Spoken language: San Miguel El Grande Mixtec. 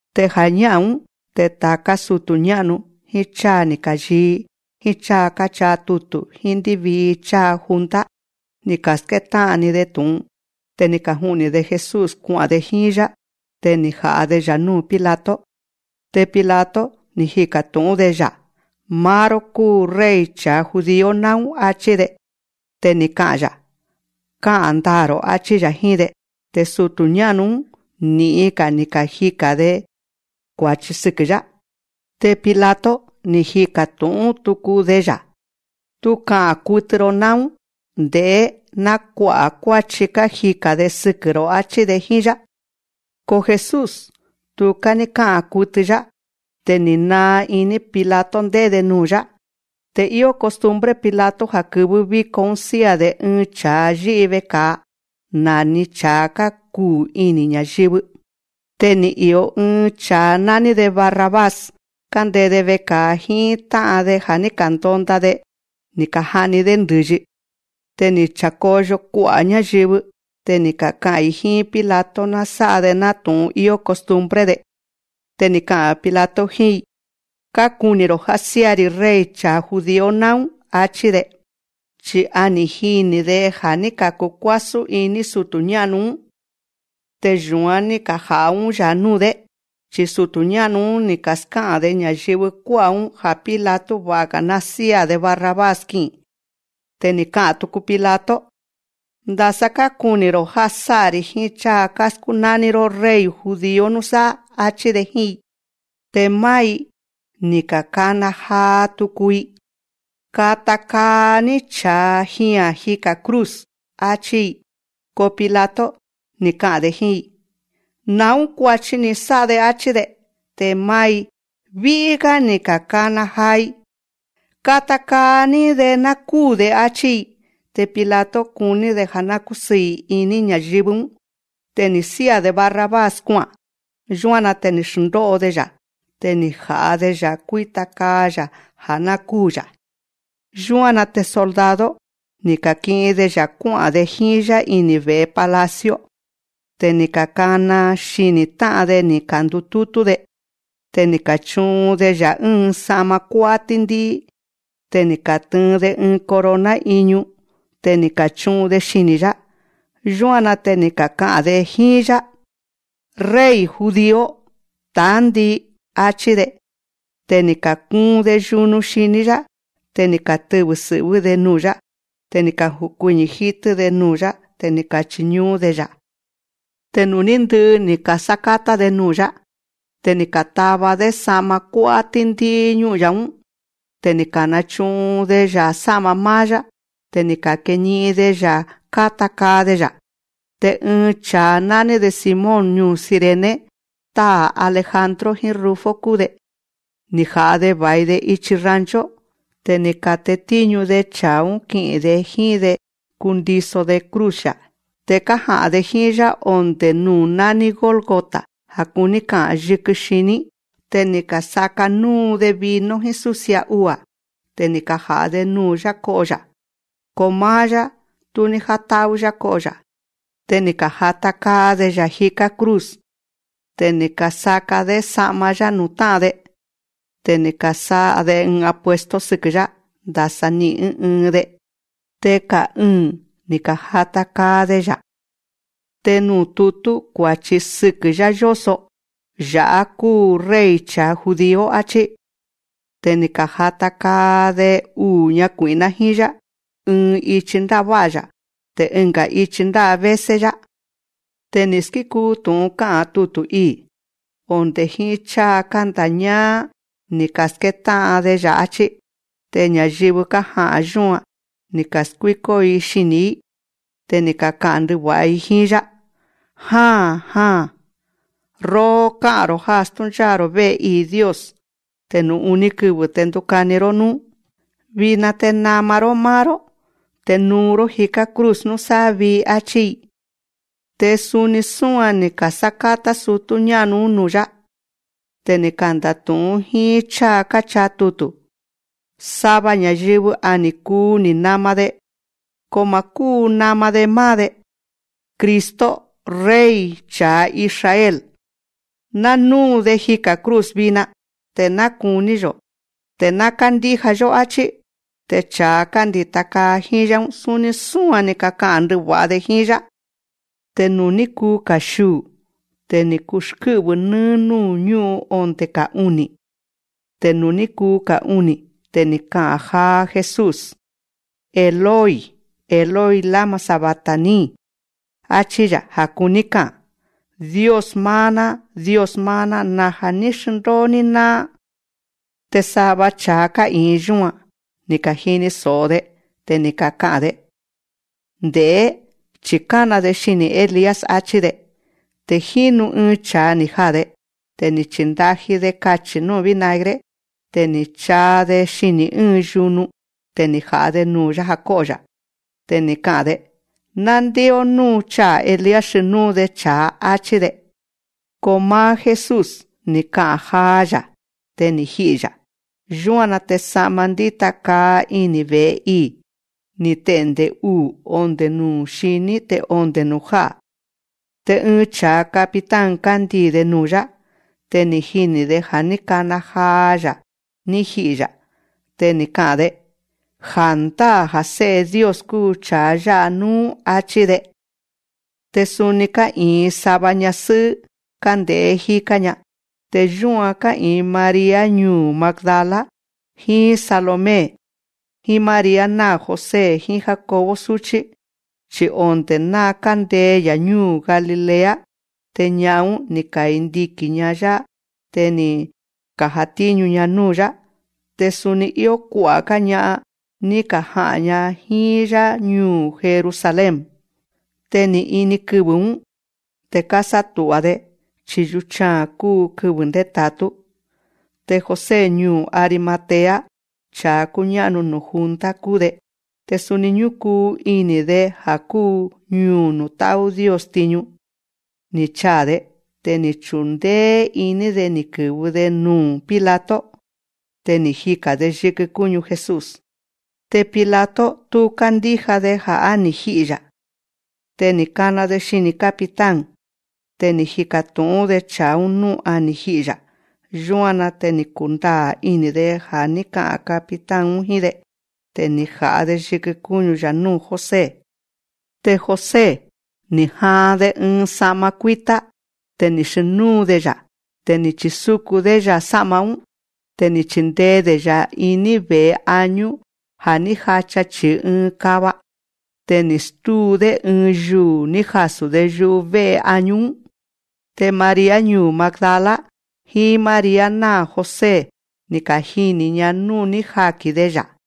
Te ja̱ñá'a̱n‑ún, te ta̱ká sutu̱ ñá'nu, jíín cháa ni̱ ka̱yii, jíín cháa káchaa tutu̱, jíín ndívii cháa junta, ni̱ ka̱skétá'an‑ni‑de tu̱'un. Te ni̱ kaju'ni̱‑de Jesús kua'a̱n‑de jíín‑yá. Te ni̱ kaja̱'a‑de‑ya̱ núu̱ Pilato. Te Pilato, ni̱ jika̱ tu̱'ún‑de‑ya̱: Máá‑ró kúu Rey cha̱a judío náún, áchí‑de. Te ni̱ ka'a̱n‑ya̱: Ká'a̱n ndaa̱‑ro̱, áchí‑ya̱ jíín‑de. Te sutu̱ ñá'nu‑ún, ni̱'in ni̱ kajika̱n‑de kua̱chi sɨkɨ̱‑yá. Te Pilato, ni̱ jika̱ tu̱'ún tuku‑de‑ya̱: Tú ka'a̱n kutɨ‑ro náún. Nde̱'é, ná kua'a̱ kuáchi kájika̱n‑de sɨkɨ̱‑ro̱, áchí‑de jíín‑yá. Ko Jesús, tuká ní ká'a̱n kutɨ‑yá. Te ni̱ naa iní Pilato ndé'é‑de nuu̱‑yá. Te íó costumbre Pilato ja̱ kɨvɨ́ víko‑ún sía̱‑de ɨɨn cha̱a yí'i veka̱a, na̱ni cha̱a kákuu ini̱ ña̱yɨvɨ. Te ni̱ i̱o ɨɨn cha̱a nání‑de Barrabás, kándee‑de veka̱a jíín tá'an‑de ja̱ ní ka̱ndonda‑de, ni̱ ka̱ja'ni‑dé ndɨ̱yi. Te ni̱ cha̱koyo kua'a̱ ñáyɨvɨ. Te ni̱ kaka'a̱n‑i jíín Pilato ná sá'a‑de nátu̱'un íó costumbre‑de. Te ni̱ ka'a̱n Pilato jíín‑i: Kákuni̱‑ro̱ já sía̱‑ri̱ Rey cha̱a judío náún, áchí‑de. Chi̱ a ni̱ jini̱‑de ja̱ ní ka̱kukuásún iní sutu̱ ñá'nu‑ún, te yu̱án ní kaja̱'a‑ún‑yá nuu̱‑dé. Chi̱ sutu̱ ñá'nu‑ún, ni̱ ka̱ská'a̱n‑de ña̱yɨvɨ kuá'a̱‑ún ja̱ Pilato va̱'a‑ga̱ ná sía̱‑de Barrabás ki'i̱n. Te ni̱ ka'a̱n tuku Pilato: Ndasa kákuni̱‑ro̱ já sá'a‑ri̱ jíín cháa káskúnání‑ró Rey judío núsáá, áchí‑de jíín‑i. Te máá‑i, ni̱ ka̱kana jaa tuku‑i: Kata kaa‑ní cha̱a jia̱n jiká cruz, áchí‑i. Ko Pilato, ni̱ ka'a̱n‑de jíín‑i: Na̱ún kua̱chi ni̱ sá'a‑de, áchí‑de. Te máá‑i, ví'í‑gá ni̱ ka̱kana jaa‑i: Kata kaa‑ní‑de ná kúu̱‑de, áchí‑i. Te Pilato, kuní‑de ja̱ ná kúsɨɨ̱ iní ña̱yɨvɨ‑ún. Te ni̱ sía̱‑de Barrabás kua'a̱n. Yúan‑na te ni̱ xndó'o‑de‑ya̱. Te ni̱ ja̱'a‑de‑ya̱ kuíta kaa‑ya̱ já ná kúu̱‑ya̱. Yúan‑na te soldado, ni̱ ka̱ki'in‑de‑ya̱ kuá'a̱n‑de jíín‑yá ini̱ ve̱'e palacio. Te ni̱ ka̱kana xini̱ tá'an‑de ni̱ ka̱ndutútú‑de. Te ni̱ ka̱chu'un‑de‑ya̱ ɨ́ɨn sa'ma kuá'á tíndí'í. Te ni̱ ka̱tɨɨn‑de ɨɨn corona iñu. Te ni̱ ka̱chu'un‑de xini̱‑yá. Yúan‑na te ni̱ kaka'a̱n‑de jíín‑yá: Rey judío, ta̱á ndii, áchí‑de. Te ni̱ ka̱kuun‑de yunu xiní‑yá. Te ni̱ katɨvɨ̱ sɨ̱'vɨ́‑de nuu̱‑yá. Te ni̱ ka̱jukuiñi̱ jítɨ́‑de nuu̱‑yá, te ni̱ ka̱chiñú'ún‑de‑ya̱. Te nuu̱ ní ndɨ'ɨ ni̱ ka̱sákátá‑de nuu̱‑yá, te ni̱ ka̱tava‑dé sa'ma kuá'á tíndí'í ñú'un‑ya̱‑ún. Te ni̱ ka̱nachu'un‑de‑ya̱ sá'ma máá‑yá, te ni̱ ka̱keni'in‑de‑ya̱ káta kaa‑de‑ya̱. Te ɨɨn cha̱a nání‑de Simón ñuu̱ Cirene (táa̱ Alejandro jíín Rufo kúu‑de), ni̱ ja̱'a‑de va̱i‑de ichi rancho. Te ni̱ ka̱tetíñu‑de cha̱a‑ún ki'i̱n‑de jíín‑de kundiso‑de cruz‑ya̱. Te kája'a̱n‑de jíín‑yá onde̱ nuu̱ nání Gólgota, ja̱ kuní ka'a̱n: yikɨ xiní. Te ni̱ ka̱sáká núu‑de vino jíín súsia ua̱. Te ni̱ kaja̱'a‑de nuu̱‑yá ko'o‑ya̱. Ko máá‑yá, tú ní játá'ú‑yá ko'o‑ya̱. Te ni̱ ka̱jata kaa‑de‑ya̱ jiká cruz. Te ni̱ ka̱saka‑dé sa'ma‑yá nuu̱ tá'an‑de. Te ni̱ ka̱sá'a‑de apuesto sɨkɨ̱, ndasa ni'i̱n, ɨ́ɨn ɨɨn‑de. Te ka̱'ɨɨ̱n ni̱ ka̱jata kaa‑de‑ya̱. Te nuu̱ tutú kua̱chi sɨkɨ̱‑yá yóso: Ya̱'á kúu Rey cha̱a judío, áchí. Te ni̱ ka̱jata kaa‑de uu̱ ñakui̱'ná jíín‑yá, ɨɨn ichi ndává'a‑ya̱, te ɨnga̱ ichi ndávésé‑yá. Te ni̱ skikuu tu̱'un ká'a̱n tutu̱ ii̱: Onde̱ jíín cháa kánda̱ñáá ní ka̱skétá'an‑de‑ya̱, áchí. Te ña̱yɨvɨ kája̱'a yúan, ni̱ ka̱skuíkó‑i xini̱‑í. Te ni̱ kaka'a̱n ndɨva̱'a‑i jíín‑yá: Ja̱n jaa̱n. Róó, ká'a̱n‑ro̱ já stúncháa̱‑ro̱ vé'e ii̱ Dios, te nuu̱ uní kɨvɨ̱ te ndukani‑ró núú. Vina te nama‑ró máá‑ró, te nuu‑ró jiká cruz núsáá vii, áchí‑i. Te suni súan ni̱ ka̱sákátá sutú ñá'nu‑ún nuu̱‑yá. Te kándatu̱'ún jíín cháa káchaa tutu̱: Sava ña̱yɨvɨ á ni̱ kuu ni̱ nama‑de, ko ma̱ kúu nama‑de máá‑de. Cristo, Rey cha̱a Israel, ná núu‑de jika̱ cruz vina, te ná kuní‑yo̱, te ná kándíja‑yó, áchí. Te cha̱a kándi̱ta kaa jíín‑yá‑ún, suni súan ni̱ kaka'a̱n ndɨva̱'a‑de jíín‑yá. Te nuu̱ ní kuu ka̱xiuu̱, te ni̱ kuxkɨ́'vɨ̱ nɨ́ɨ́ núu̱ ñú'un onde̱ ka̱'uni̱. Te nuu̱ ní kuu ka̱'uni̱, te ni̱ ka'a̱n jaa Jesús: Eloi, Eloi, lama sabactani, achí‑ya̱. Ja̱ kuní ka'a̱n: Dios máá‑ná, Dios máá‑ná, naja̱ ní xndóo‑ní náá. Te sava cha̱a ká'i̱in yúan, ni̱ ka̱jini so̱'o‑de. Te ni̱ kaka'a̱n‑de: Nde̱'é, chi̱ kána‑de xini̱ Elías, áchí‑de. Te jínu ɨɨn cha̱a ni̱ jaa̱‑de, te ni̱ chíndájí‑de kachi̱ núu̱ vinagre. Te ni̱ chaa‑de xini̱ ɨ́ɨn yunu. Te ni̱ ja̱'a‑de nuu̱‑yá ja̱ kó'o‑ya̱. Te ni̱ ka'a̱n‑de: Ná ndé'ó nú chaa̱ Elías xnúu‑de cha̱a, áchí‑de. Ko máá Jesús, ni̱ ka'a̱n jaa‑ya̱. Te ni̱ ji'i̱‑ya̱. Yúan‑na te sa'ma ndíta kaa ini̱ ve̱'e ii̱, ni̱ te'nde̱ uu̱ onde̱ nuu̱ xiní te onde̱ nuu̱ já'a̱. Te ɨɨn cha̱a capitán kándii̱‑de nuu̱‑yá. Te ni̱ jini̱‑de ja̱ ní kana jaa‑ya̱ ní ji'i̱‑ya̱. Te ni̱ ka'a̱n‑de: Ja̱ndáa̱ ja̱ Sé'e Dios kúu cha̱a yá'a núú, áchí‑de. Te suni ká'i̱in sava ñasɨ́'ɨ́ kánde̱'é jíká‑ña. Te yúan ká'i̱in María ñuu̱ Magdala, jíín Salomé, jíín María náa̱ José jíín Jacobo súchí. Chi̱ onde̱ ná kándee‑ya̱ ñúu̱ Galilea, te ña'an‑ún, ni̱ kandiki̱n‑ña‑yá. Te ni̱ ka̱jatíñu‑ña núu̱‑yá. Te suni íó kua'a̱‑gá‑ña, ni̱ kaja'a̱n‑ña jíín‑yá ñuu̱ Jerusalén. Te ni̱ ini kɨvɨ̱‑ún. Te kásátu̱'a‑de, chi̱ yuchaa̱n kúu kɨvɨ̱ ndéta̱tú. Te José ñuu̱ Arimatea, cha̱a kúñá'nu nuu̱ junta kúu‑de, te suni ñúkuu ini̱‑de ja̱ kúu ñuu̱ nuu̱ tá'ú Dios tiñu, ni̱ chaa̱‑de. Te ni̱ chundéé iní‑de ni̱ kɨ̱vɨ‑de nuu̱ Pilato. Te ni̱ jika̱n‑de yikɨ kúñu Jesús. Te Pilato, tú kándíja‑de ja̱ á ni̱ ji'i̱‑ya̱. Te ni̱ kana‑de xini̱ capitán. Te ni̱ jika̱ tu̱'ún‑de cha̱a‑ún nú a ni̱ ji'i̱‑ya̱. Yúan‑na te ni̱ kundaa̱ ini̱‑de ja̱ ní ka'a̱n capitán‑ún jíín‑de. Te ni̱ ja̱'a‑de yikɨ kúñu‑ya̱ núu̱ José. Te José, ni̱ jaan‑de ɨɨn sa'ma kuítá. Te ni̱ xnúu‑de‑ya̱. Te ni̱ chisukun‑dé‑ya̱ sá'ma‑ún. Te ni̱ chindee‑de‑ya̱ iní ve̱'e añú ja̱ ní jacha chi̱i ɨɨn kava. Te ni̱ stúu‑dé ɨɨn yuu̱ ní jasu̱‑de yuvé'e añú‑ún. Te María ñuu̱ Magdala, jíín María náa̱ José, ni̱ kajini̱‑ña núu̱ ní jaki̱n‑de‑ya̱.